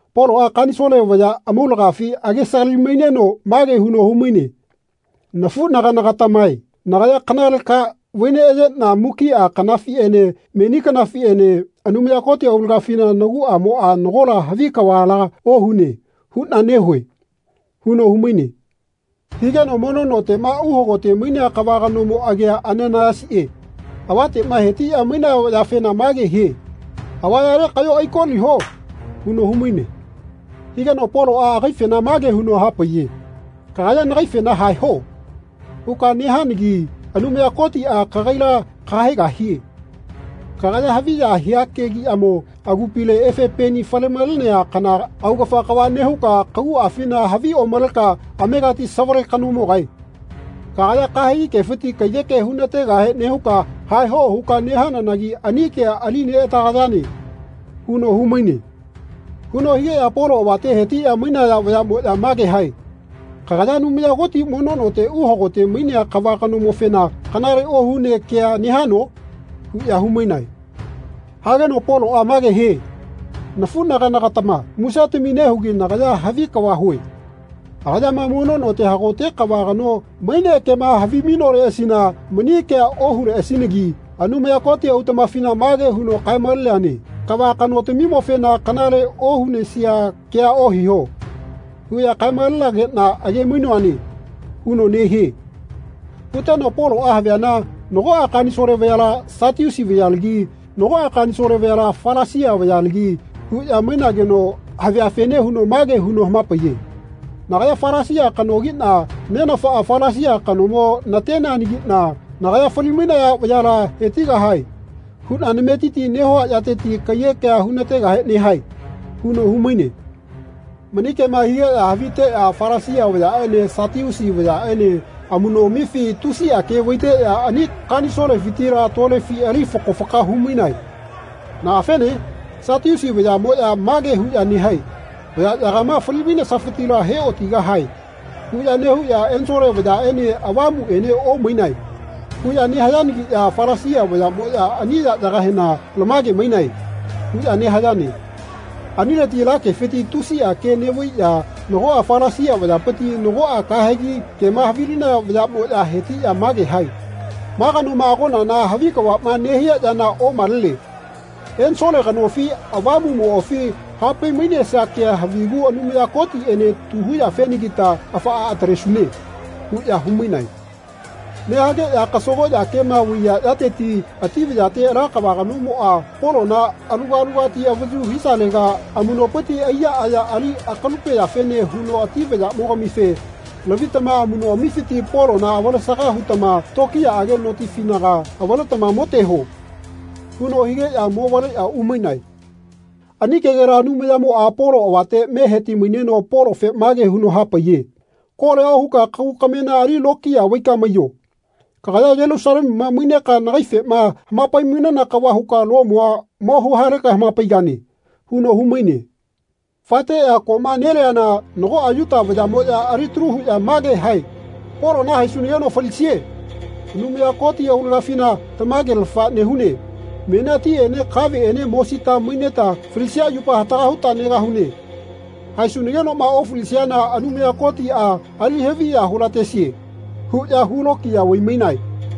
Poloꞌa Kanisole vaya amaulagafi agesagali-maineno mage huno humaine “Nafuꞌnaganagatamae nagaya kanale ka vai neꞌayeꞌna mukiꞌa kanafiꞌene meni kanafiꞌene Anumaya Koti aulagafina naguꞌamoꞌa nagola havi kavala ohune huꞌna nehue.” huno humaine. Higeno mono noteꞌma uhagote mainea kava kanomo agia Ananaiyasiꞌe avateꞌma hetiꞌya maiya vayafena mage hie “Avayale kaꞌyo aikoliho.” huno humaine. Higeno Poloꞌa agaifena mage huno hapaiye “Kagaya nagaifena ‘Haeho.’ huka nehananagi Anumaya Kotiꞌa kagaila kahaegahie. Kagaya haviya hia kegiꞌyamo agupile efe peni fale-malenea kana augafa kava nehuka kaguꞌafina havi omaleka amegati savale kanomogae. Kagaya kahegi kefiti kaiyeke hunategahe nehuka ‘Haehoꞌ huka nehananagi ani kea ali neꞌatagayane.” huno humaine. Huno higeꞌya Polo avate hetiꞌya mainaya vayaꞌmoꞌya mage hae “Kagaya Anumaya Koti mono note uhagote mainea kava kanomofena kanale ohunea kea nehano?” huꞌya humainae. Hageno Poloꞌa mage hie “Nafuꞌnaganagatama musetami nehugi nagaya havi kava hue. Agayama mono note hagote kava kano maine kema havimainoleꞌasina mani kea ohuleꞌasinagi. Anumaya Koti autaꞌmafina mage huno kae-maleneane ‘Kava kanotamimofena kanale ohunesia kea ohiho.’ huꞌya kae-malenageꞌna age-mainoane.” huno nehie. Huteno Poloꞌa haviana nagoꞌa Kanisole vayala Satiusi vayalagi nagoꞌa Kanisole vayala Falasia vayalagi huꞌya mainageno haviafene huno mage huno hamapaiye “Nagaya Falasia kanogiꞌna nenafaꞌa Falasia kanomo nateneanagiꞌna nagaya ‘Fali-mainaya vayala hetigahae.’ huꞌna nametiti nehua yateti kaiyekea hunategahe nehae.” huno humaine. Mani kema higeꞌya haviteꞌya Falasia vayaꞌene Satiusi vayaꞌene amuꞌnoꞌamifi tusiꞌa ke vaiteꞌya ani Kanisolefitila tolefi ali fako faka humainae. Naꞌafene? Satiusi vayaꞌmoꞌya mage huꞌya nehae “Vayaꞌyagama fali-mainesafitila heꞌotigahae.” huꞌya nehuꞌya “Ensole vayaꞌene avamuꞌene omainae.” huꞌya nehayangiꞌya Falasia vayaꞌmoꞌya ani yaꞌyagahena “Lamage mainae.” huꞌya nehayane. Anileti ala kefiti tusiꞌa ke neꞌvaiꞌya nagoꞌa Falasia vayapiti nagoꞌa kahegi kema havilinaya vayaꞌmoꞌya hetiꞌya mage hae “Ma kanoma agonana havi kavaꞌma nehia yana omalene. Ensole kanofi avamuꞌmoꞌafi hapai-mainesia kea havigu Anumaya Kotiꞌene tu huyafenagita afaꞌa atalesune.” huꞌya humainae. Nehageꞌya kasagoꞌya kema vaiya yateti ati vayate ala kava kanomoꞌa Polona aluga alugati avayu hisalega amuꞌnopiti aiya aya ali akalupeyafene huno ati vayaꞌmogamife “Lavitama amuꞌnoꞌamifiti Polona avalesaga hutama tokiyaꞌage notifinaga avaletama moteho.” huno higeꞌya movaleꞌya umainae. Ani kegela Anumayamoꞌa Polo avate me heti-maineno Polofe mage huno hapaiye “Kolia ohuka kagu kamena ali lokiya vaika maiyo. Kagaya Yelusalemuma maineka nagaifema hamapai-mainana kava huka Lomua mo huhaleka hamapaigane.” huno humaine. Faeteꞌya koꞌma neliana nagoꞌa Yuta vayaꞌmoꞌya alitalu huꞌya mage hae “Polona haesunageno falisie. Anumaya Koti aulagafina tamagelafa nehune menia tiꞌene kaveꞌene mosita maineta falisia yupa hataka huta negahune. Haesunagenoꞌma ofalisiana Anumaya Kotiꞌa ali-haviya hulatesie huꞌya hulokiya vai-mainae.”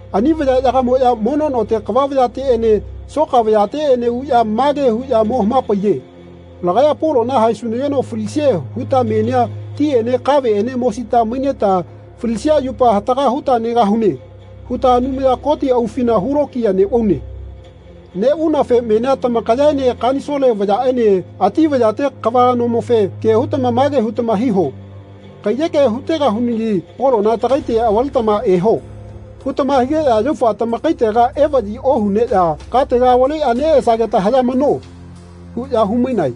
Ani vayaꞌyagamoꞌya mono note kava vayateꞌene soka vayateꞌene uꞌya mage huꞌya mo hamapaiye “Lagaya Polona haesunageno falisie huta menia tiꞌene kaveꞌene mosita maineta falisia yupa hataka huta negahune huta Anumaya Koti aufina hulokiya neꞌvaune. Neꞌvaunafe menia tamakayaene Kanisole vayaꞌene ati vayate kava kanomofe ke hutama mage hutama hiho ‘Kaiyeke hutegahunagi Polona tagaite avaletama eho.’ hutama higeꞌya yaufa tamakaitega evaꞌyi ohuneꞌya katega avaleꞌya neꞌesageta hayamano.” huꞌya humainae.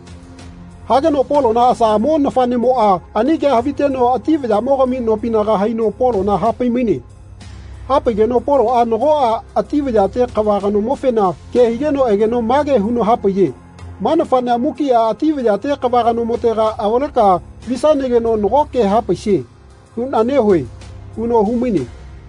Hageno Polona asaꞌamo nafaꞌnemoꞌa ani kea haviteno ati vayaꞌmogami nopinaga haino Polona hapai-maine. Hapaigeno Poloꞌa nagoꞌa ati vayate kava kanomofena ke higeno egeno mage huno hapaiye “Ma nafaꞌnea mukiꞌa ati vayate kava kanomotega avaleka visanageno nago ke hapaisie huꞌna nehue.” huno humaine.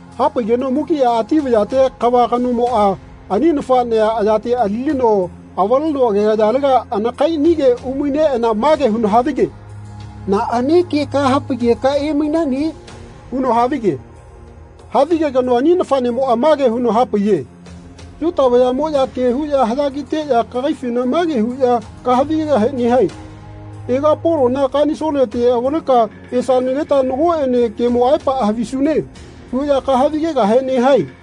Hapaigeno mukiꞌa ati vayate kava kanomoꞌa ani nafaꞌnea ayate alilino avaleno agegayalega anakaiꞌanige umaineꞌana mage huno havige “Naꞌane ke nahapaigahe emainane?” huno havige. Havigegeno ani nafaꞌnemoꞌa mage huno hapaiye “Yuta vayaꞌmoꞌya ke huꞌya haꞌya kiteꞌya kagaifena mage huꞌya kahavi-gegahe nehae ‘Ega Polona Kanisolete avaleka esanageta nagoꞌene kemo aepaꞌa havisune.’ huꞌya kahavi-gegahe nehae.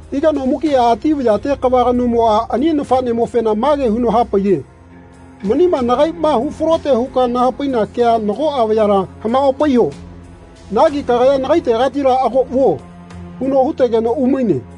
Higeno mukiꞌa ati vayate kava kanomoꞌa ani nafaꞌnemofena mage huno hapaiye “Manima nagaiꞌma hufalote huka nahapaina kea nagoꞌa vayala hamaꞌopaiyo. Nagi kagaya nagaitegatila ago vuo.” huno hutegeno umaine.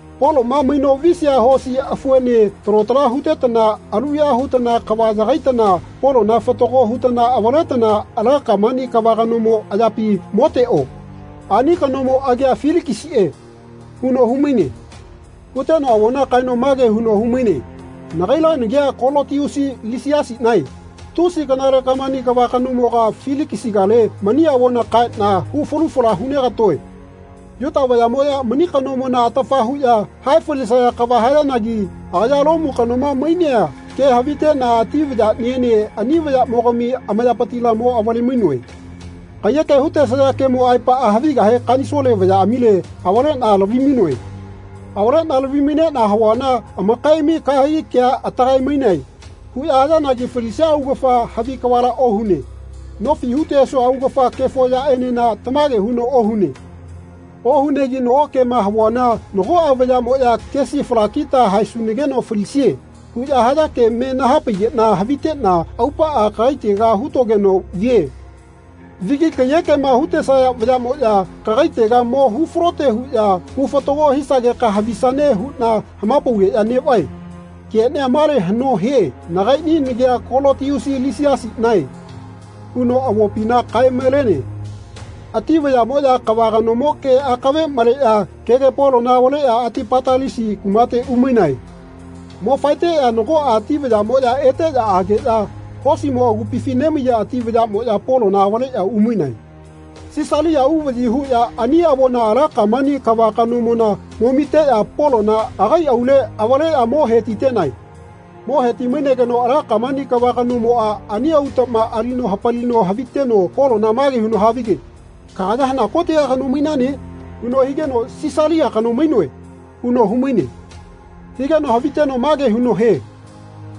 Poloꞌma maino visia hosi afuene talo tala hutetana aluya hutana kava yagaitana Polona fatago hutana avaletana ala Kamani kava kanomo ayapi moteꞌo. Ani kanomo agia Filikisiꞌe.” huno humaine. Huteno avona kaeno mage huno humaine “Nagaila nagia Kolotiusi Lisiasiꞌnae tusi kanale Kamani kava kanomoga Filikisigale mani avona kaeꞌna hu falu fala hunegatoe. Yuta vayaꞌmoꞌya mani kanomona atafa huꞌya hae falisaya kava hayanagi agaya Lomu kanoma mainea ke haviteꞌna ati vayaꞌniene ani vayaꞌmogami amayapitila mo-vale-mainoe. Kaiyeke hutesaya kemo aepaꞌa havigahe Kanisole vayaꞌamile avaleꞌna lavimainoe. Avaleꞌna lavi-maineꞌna havuana amakaiꞌami ‘Kahegi kea atagae-maine.’ huꞌya hayanagi falisia augafa havi kavala ohune. Nofi hutesua augafa kefo yaꞌenena tamage huno ohune. Ohunegi nago kema havuana nagoꞌa vayaꞌmoꞌya ‘Kesi falakita haesunageno falisie.’ huꞌya haya ke me nahapaigeꞌna haviteꞌna aupaꞌa kagaitega hutogeno vie. Vigi kaiyekema hutesaya vayaꞌmoꞌya kagaitega mo hufalote huꞌya hu fatago hisageka havisane huꞌna hamapaugeꞌya neꞌvae. Keꞌnia male haꞌno hie nagaiꞌni nagia Kolotiusi Lisiasiꞌnae.” huno avopina kae-malene. Ati vayaꞌmoꞌya kava kanomo ke akave maleꞌya kege Polona avaleꞌya Atipatalisi kumate umainae. Mo faeteꞌya nagoꞌa ati vayaꞌmoꞌya eteꞌya ageꞌya hosimo agupifi nemaiya ati vayaꞌmoꞌya Polona avaleꞌya umainae. Sisalia uvaꞌyi huꞌya ani avona ala Kamani kava kanomona mo-miteꞌya Polona agai aule avaleꞌya mo hetitenae. Mo heti-mainegeno ala Kamani kava kanomoꞌa ani autaꞌma alino hapalino haviteno Polona mage huno havige “Kagaya hana kotega kano mainane?” huno higeno “Silisia kano mainoe.” huno humaine. Higeno haviteno mage huno hie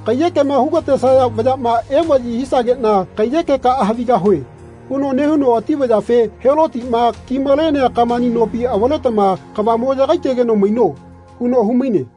“Kaiyekema hugatesaya vayaꞌma evaꞌyi hisageꞌna kaiyekekaꞌa havigahue.” huno nehuno ati vayafe “Helotiꞌma kimalenea Kamani nopi avaletama kava mo yagaitegeno maino.” huno humaine.